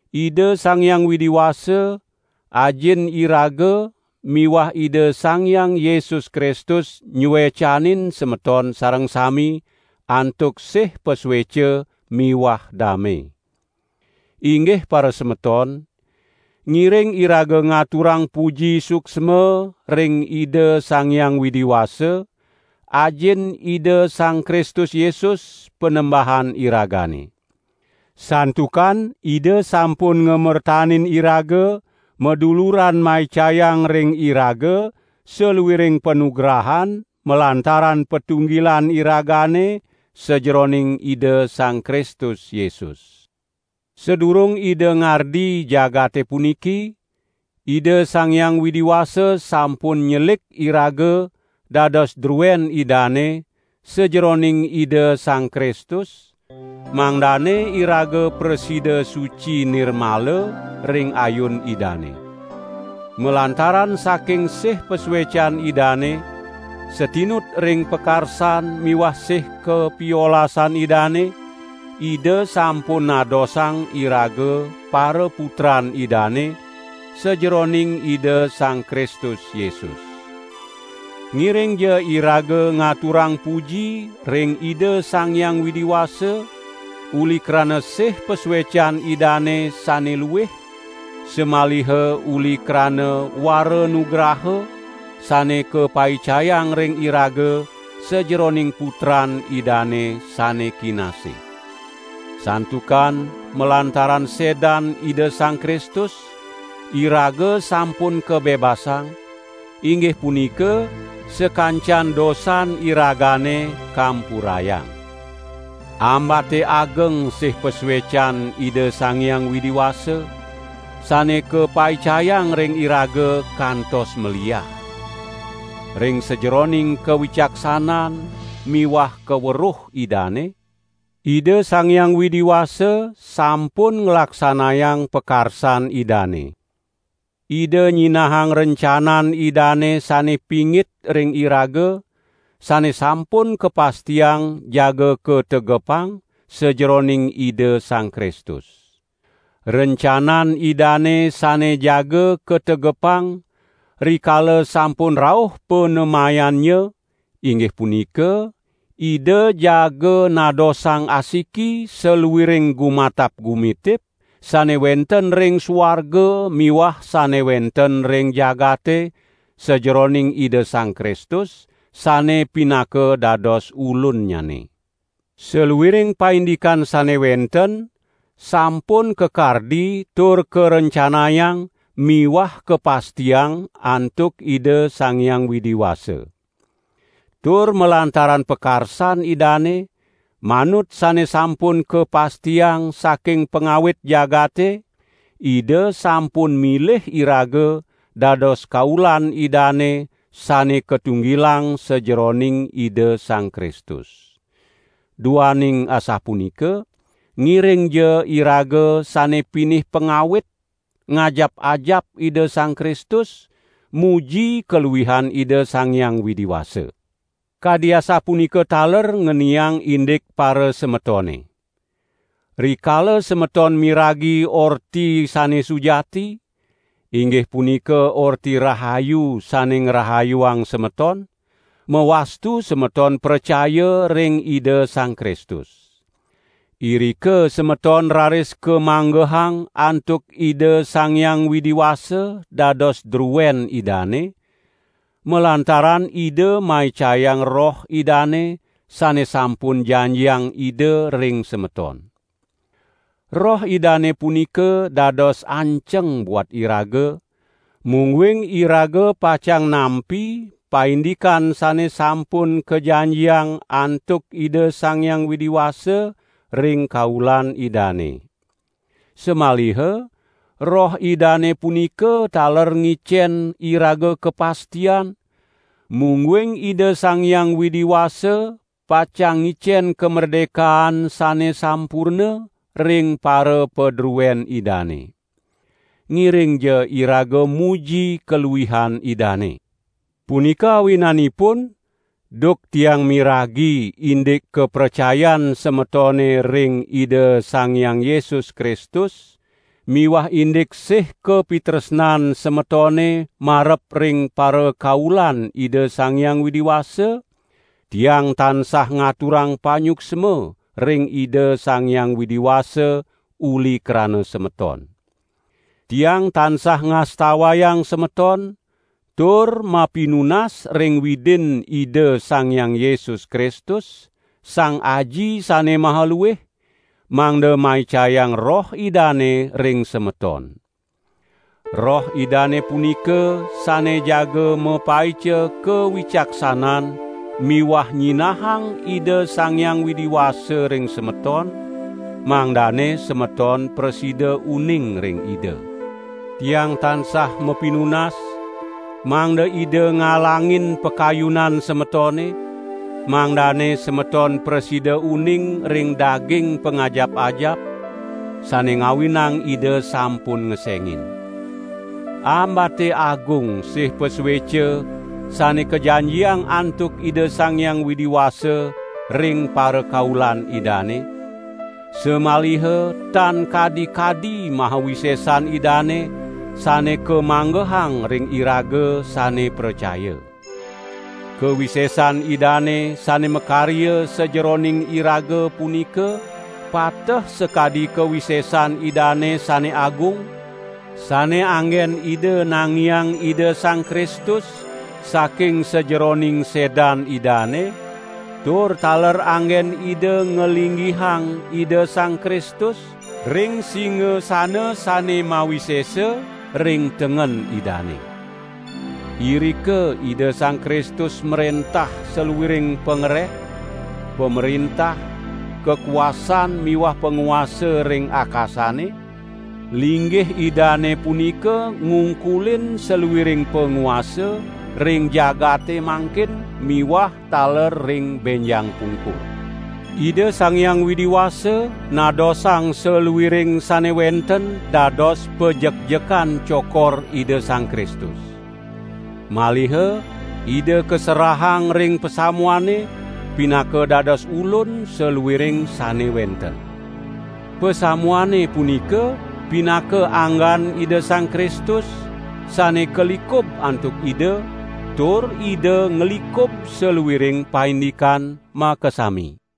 Ida Sang Hyang Widi Wasa, Ajin iraga miwah Ida Sang Hyang Yesus Kristus nyuecanin semeton sareng sami antuk sih pasueca miwah dame. Inggih parasemeton, ngiring iraga ngaturang puji suksma ring Ida Sang Hyang Widi Wasa, Ajin Ida Sang Kristus Yesus, Panembahan iragane. Santukan Ida sampun ngamertanin iraga maduluran maicayang ring iraga saluiring panugrahan malantaran patunggilan iragane sajeroning Ida Sang Kristus Yesus. Sadurung Ida ngardi jagate puniki Ida Sang Hyang Widi Wasa sampun nyelik iraga dados druen Idane sajeroning Ida Sang Kristus, mangdane iraga prasida suci nirmala ring ayun Idane. Malantaran saking sih pasuecan Idane, satinut ring pakarsan miwah sih kapiolasan Idane, Ida sampun nadosang iraga paraputran Idane, sajeroning Ida Sang Kristus Yesus. Ngiringja iraga ngaturang puji ring Ida Sang Hyang Widi Wasa, uli krana sih pasuecan Idane sane luih samaliha uli krana waranugraha, sane kapaicayang ring iraga sajeroning Putran Idane sane kinasih. Santukan malantaran sedan Ida Sang Kristus, iraga sampun kabebasang, inggih punika sakancan dosan iragane kampurayang. Ambate ageng sih pasuecan Ida Sang Hyang Widi Wasa, sane kapaicayang ring iraga kantos maliah. Ring sajeroning kawicaksanan miwah kaweruh Idane, Ida Sang Hyang Widi Wasa sampun nglaksanayang pakarsan Idane. Ida nyinahang rencanan Idane sane pingit ring iraga, sane sampun kapastiang jaga kategepang sajeroning Ida Sang Kristus. Rencanan Idane sane jaga kategepang rikala sampun rauh panemayannya, inggih punika, Ida jaga nadosang asiki saluiring gumatap-gumitip, sane wenten ring suarga miwah sane wenten ring jagate sajeroning Ida Sang Kristus, sane pinaka dados Ulunnyane. Saluiring paindikan sane wenten sampun kakardi tur karencanayang miwah kapastiang antuk Ida Sang Hyang Widi Wasa. Tur malantaran pakarsan Idane, manut sane sampun kapastiang saking pangawit jagate, Ida sampun milih iraga dados kaulan Idane sane katunggilang sajeroning Ida Sang Kristus. Duaning asapunika, ngiringja iraga sane pinih pangawit ngajap-ajap Ida Sang Kristus, muji kaluihan Ida Sang Hyang Widi Wasa! Kadi asapunika taler ngeniang indik parasemetone. Rikala semeton miragi Orti Sane Sujati, inggih punika Orti Rahayu sane ngrahayuang semeton, mawastu semeton pracaya ring Ida Sang Kristus. Irika semeton raris kamanggehang antuk Ida Sang Hyang Widi Wasa dados druen Idane, malantaran Ida maicayang Roh Idane sane sampun janjiang Ida ring semeton. Roh Idane punika dados anceng buat iraga, mungguing iraga pacang nampi paindikan sane sampun kajanjiang antuk Ida Sang Hyang Widi Wasa ring kaulan Idane. Samaliha Roh Idane punika taler ngicen iraga kapastian, mungguing Ida Sang Hyang Widi Wasa pacang ngicen kamerdekaan sane sampurna ring parapadruen Idane. Ngiringja iraga muji kaluihan Idane! Punika awinanipun, duk tiang miragi indik kapracayan semetone ring Ida Sang Hyang Yesus Kristus miwah indik sih kapitresnan semetone marep ring parakaulan Ida Sang Hyang Widi Wasa, tiang tansah ngaturang panyuksma ring Ida Sang Hyang Widi Wasa uli krana semeton. Tiang tansah ngastawayang semeton tur mapinunas ring Widin Ida Sang Hyang Yesus Kristus, Sang Aji sane maha luih, mangda maicayang Roh Idane ring semeton. Roh Idane punika sane jaga mapaica kawicaksanan miwah nyinahang Ida Sang Hyang Widi Wasa ring semeton, mangdane semeton prasida uning ring Ida. Tiang tansah mapinunas, mangda Ida ngalangin pakayunan semetone, mangdane semeton prasida uning ring daging pangajap-ajap, sane ngawinang Ida sampun ngesengin. Ambate agung sih pasueca sane kajanjiang antuk Ida Sang Hyang Widi Wasa ring parakaulan Idane, samaliha tan kadi-kadi maha wisesan Idane sane kamanggehang ring iraga sane pracaya. Kawisesan Idane sane makarya sajeroning iraga punika pateh sakadi kawisesan Idane sane agung, sane anggen Ida nangiang Ida Sang Kristus saking sajeroning sedan Idane tur taler anggen Ida ngalinggihang Ida Sang Kristus ring singasana sane mawisesa ring tengen Idane. Irika Ida Sang Kristus mrentah saluiring pangreh, pamrentah, kakuasan miwah panguasa ring akasane; linggih Idane punika ngungkulin saluiring panguasa, ring jagate mangkin miwah taler ring benjang pungkur. Ida Sang Hyang Widi Wasa nadosang saluiring sane wenten dados pajekjekan cokor Ida Sang Kristus. Maliha Ida kaserahang ring pasamuane, pinaka dados Ulun saluiring sane wenten. Pasamuane punika pinaka anggan Ida Sang Kristus, sane kalikub antuk Ida, tur Ida nglikub saluiring paindikan makasami.